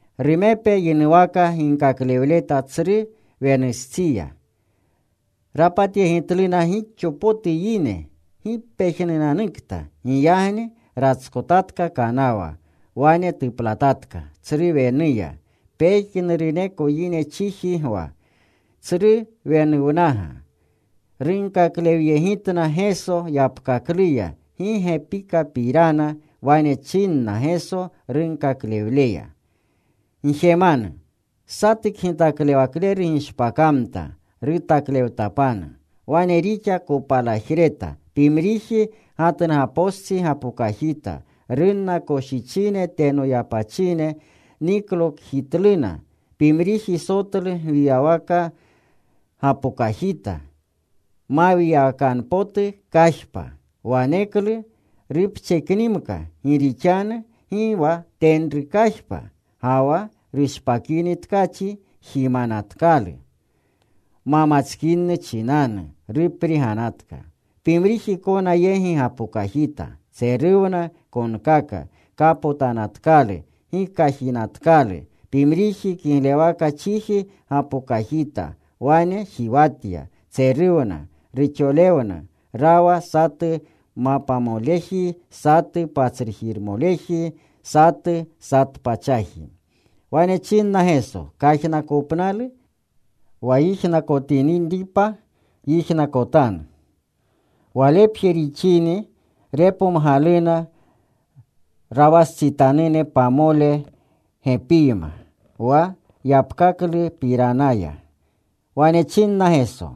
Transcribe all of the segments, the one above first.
Rumepe yinuwaka ginkaklewleta tsru wenustsiya. Rapatyegitluna gixo potu yine. ¡Gi pejnunanukta! Giyagni ratskotatka kanawa. Wane tuplatatka tsru wenuya. Pejnuruneko yine chiji gwa, tsru wenuwnaga. Runkaklewyegitna Geso yapkakluya gi gepikapirana. Wane chinna Geso runkaklewleya, “Gjemanu. Satu kgitaklewakleru gishpakamta rutaklewtapanu. Wane rixa kopalajreta. Pimriji gatnugapostsi gapokajita. Runna koshichine teno yapachine. Niklokajitluna. Pimriji sotlu gwiyawaka gapokajita mawiyawakanu potu kajpa. Waneklu rupcheknimka gi rixanu gi wa tenru kajpa. Ga wa rushpakini tkachi jimanatkalu. Ma matskinu chinanu rupriganatka. Pimriji kona yegi gapokajita. Tseruwna konkaka. Kapotanatkalu. Gi kajinatkalu. Pimriji kiglewaka chiji, gapokajita. Wane jiwatya. Tseruwna. Ruxolewna. Rawa satu mapamoleji, satu patsrujirmoleji, satu satu pachaji.” Wane chinna Geso, “Kajnakopnalu wa yijnakotinripa, yijnakotanu.” Walepje rixini repomgaluna rawastsitanune pamole gepiyma wa yapkaklupiranaya. Wane chinna Geso,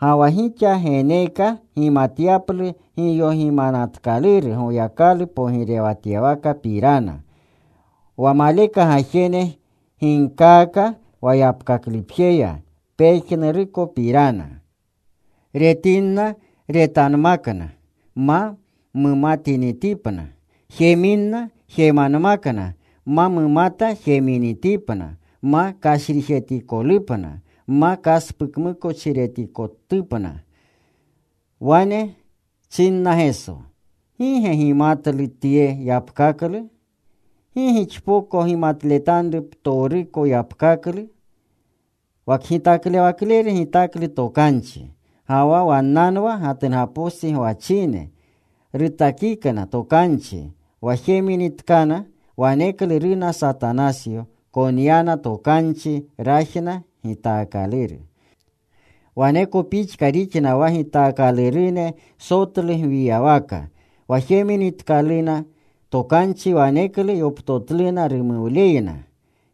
“Ga wa gixa geneeka gimatyaplu giyogimanatkaluru Goyakalu pogirewatyawakapirana. Wa maleka gajene ginkaaka yapkaklupjeya pejnurukopirana. Retinna retanmakna, ma mumatinitipna. Jeminna, jemanmakna, ma mumata jeminitipna, ma kashrijetikotupna, ma kaspukmukochiretkanupna.” Wane chinna Geso, “¿Gi ge gimatlu tye yapkaklu? ¿Gi gixpoko gimatletanru ptowruko yapkaklu? Wa kgitaklewakleru gitaklu tokanchi. Ga ga wannanwa gatnugapostsi gwachine. Rutakikna tokanchi. Wa jeminitkana waneklu runa Satanasyo. Konyanna tokanchi rajna gitaakaluru. Waneko pixka rixna wa gitaakalurune sotlu gwiyawaka. Wa jeminitkaluna tokanchi waneklu yoptotluna rumuwleyna.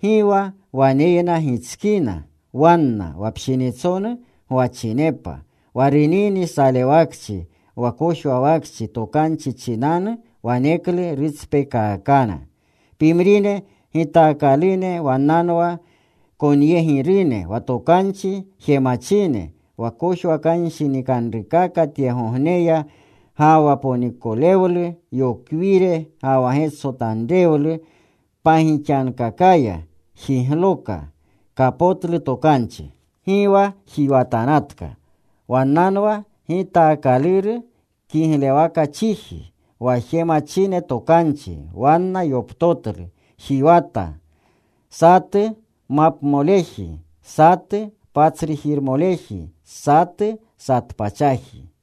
Gi wa waneyna gitskina wanna. Wa pshinitsonu gwachinepa. Wa runini salewakchi, wa kojwawakchi tokanchi chinanu waneklu rutspekaakana. Pimrine gitaakalune wannanwa konyegirune wa tokanchi jemachine. Wa kojwakanshinikanrukaka tyegogneya ga wa ponikolewlu yokwire ga wa getsotanrewlu pagixankakaya jigloka. Kapotlu tokanchi. Gi wa jiwatanatka. Wannanwa gitaakaluru kiglewaka chiji, wa jemachine tokanchi. Wanna yoptotlu. Jiwatna, satu mapamoleji, satu patsrujirmoleji, satu satu pachaji.”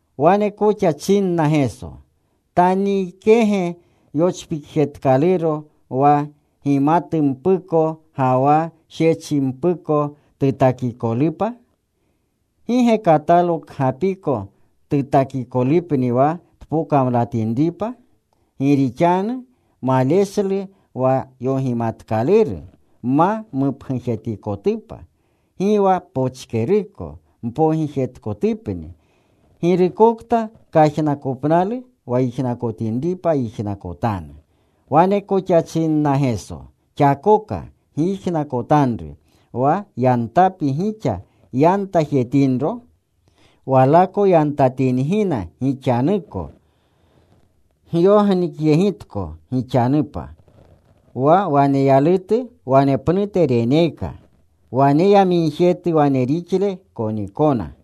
Wane koxa chinna Geso, “¿Taniikege yochpikjetkalurompuko wa gimatumpuko ga wa shechimpuko tutakikolupa? ¿Gi ge katalo kgapiko tutakikolupni, wa tpokamlatinripa? Gi rixanu maleshlu wa yogimatkaluru ma mupgujetikotupa. Gi wa pochkeruko mpogijetkotupni. Girukokta kajnakopnalu wa yijnakotinripa, yijnakotanu.” Wane koxa chinna Geso, “Xakoka gyijnakotanru. Wa yantapi gixa yantajetinro, walako yantatingina gixanuko. Gyognikyegitko gixapa. Wa waneyalutu wanepnute reneeka. Waneyamigjetu wane rixle konikona.”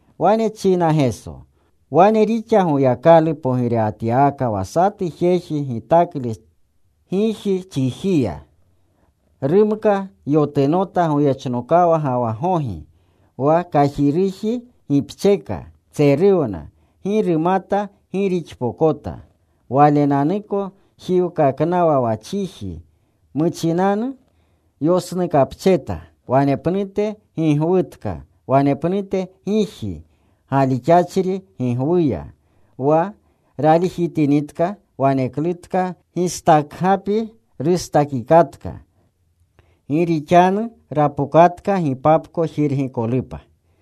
Wane china Geso, “Wane rixa Goyakalu pogirewatyawaka wa satu jeji gitaklu giji chijiya. Rumka, yotunota, goyechno ga wa gogi. Wa kajiruji gipcheka. Tseruwna. Gi rumata gi rixpokota. Walenanuko jiwkaknawa wa chiji. Muchinanu yosnukapcheta; wanepnute gigwutka, wanepnute giji galixachri gigwuya. Wa ralijitinitka waneklutka gistakapi rustajikatka gi rixanu rapokatka gipapko jirgikolupa.”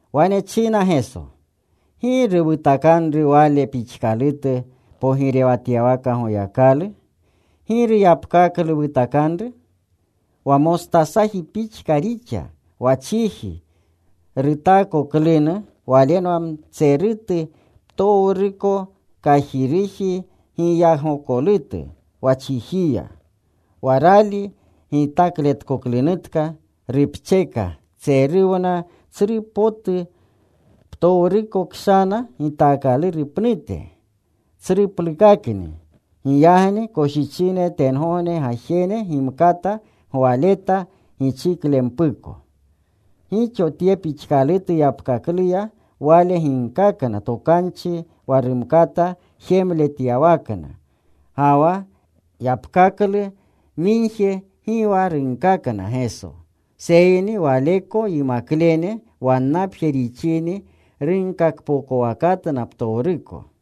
Wane china Geso, “¿Giru wutakanru wale pixkalutu pogirewatyawaka Goyakalu? ¿Giru yapkaklu wutakanru? Wa mostasaji pixka rixa. Wa chiji rutaakoklunu walenwa mtserutu ptowruko kajiruji giyagokolutu wa chijiya. Wa rali gitakletkoklunutka. Rupcheka. Tseruwna tsru potu ptowru kshana gitaakaluru pnute. Tsruplukakni. Giyagni koshichine tengogne gajene gimkata gwaleta gichiklempuko.” Gixo tye pixkalutu yapkakluya Wale ginkakna tokanchi wa rumkata jemletyawakna. Ga wa yapkaklu migje gi wa runkakna Geso, seyni Waleko yimaklene wannapje rixini runkakpokowakatna ptowruko.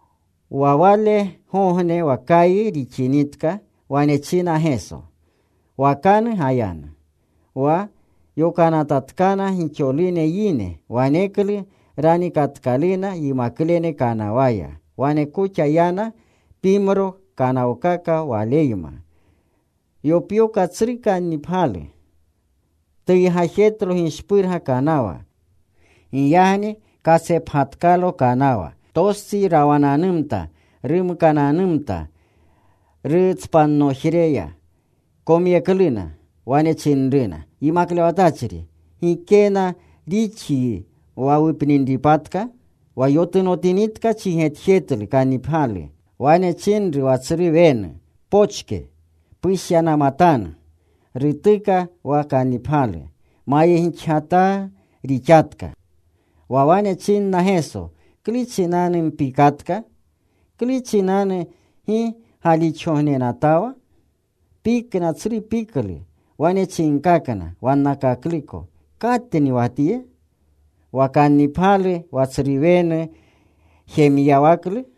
Wa walegogne wa kayi rixinitka wane chinna Geso, “Wakanu gayanu.” Wa yokanatkatkana gixolune yine. Waneklu ranikatkaluna yimaklene kanawaya. Wane koxa yana pimro kanawkaka Waleyma. Yopyoka tsru kannipgyalu. Tuygajetlo gishpurga kanawa. Giyagni katsepgatkalo kanawa. Tostsi rawananumta. Rumkananumta rutspannojreya. Komyekluna. Wane chinruna, “Yimaklewatachri, ¿gikenna rixyi wa wupninripatka?” Wa yotunotinitka chigetjetlu kannipgyalu. Wane chinru wa tsru wenu, “Pochke. Pushyanamatanu.” Rutuka wa kannipgyalu. Mayegixgataa rixanatka. Wa wane chinna Geso, “¿Klu chinanu mpikatka? ¿Klu chinanu gi galixgognenatawa?” Pikna tsru piklu. Wane chinkakna wannakakluko, “¿Katni wa Tye? Wa kannipgyalu wa tsru wenu jemyawaklu.”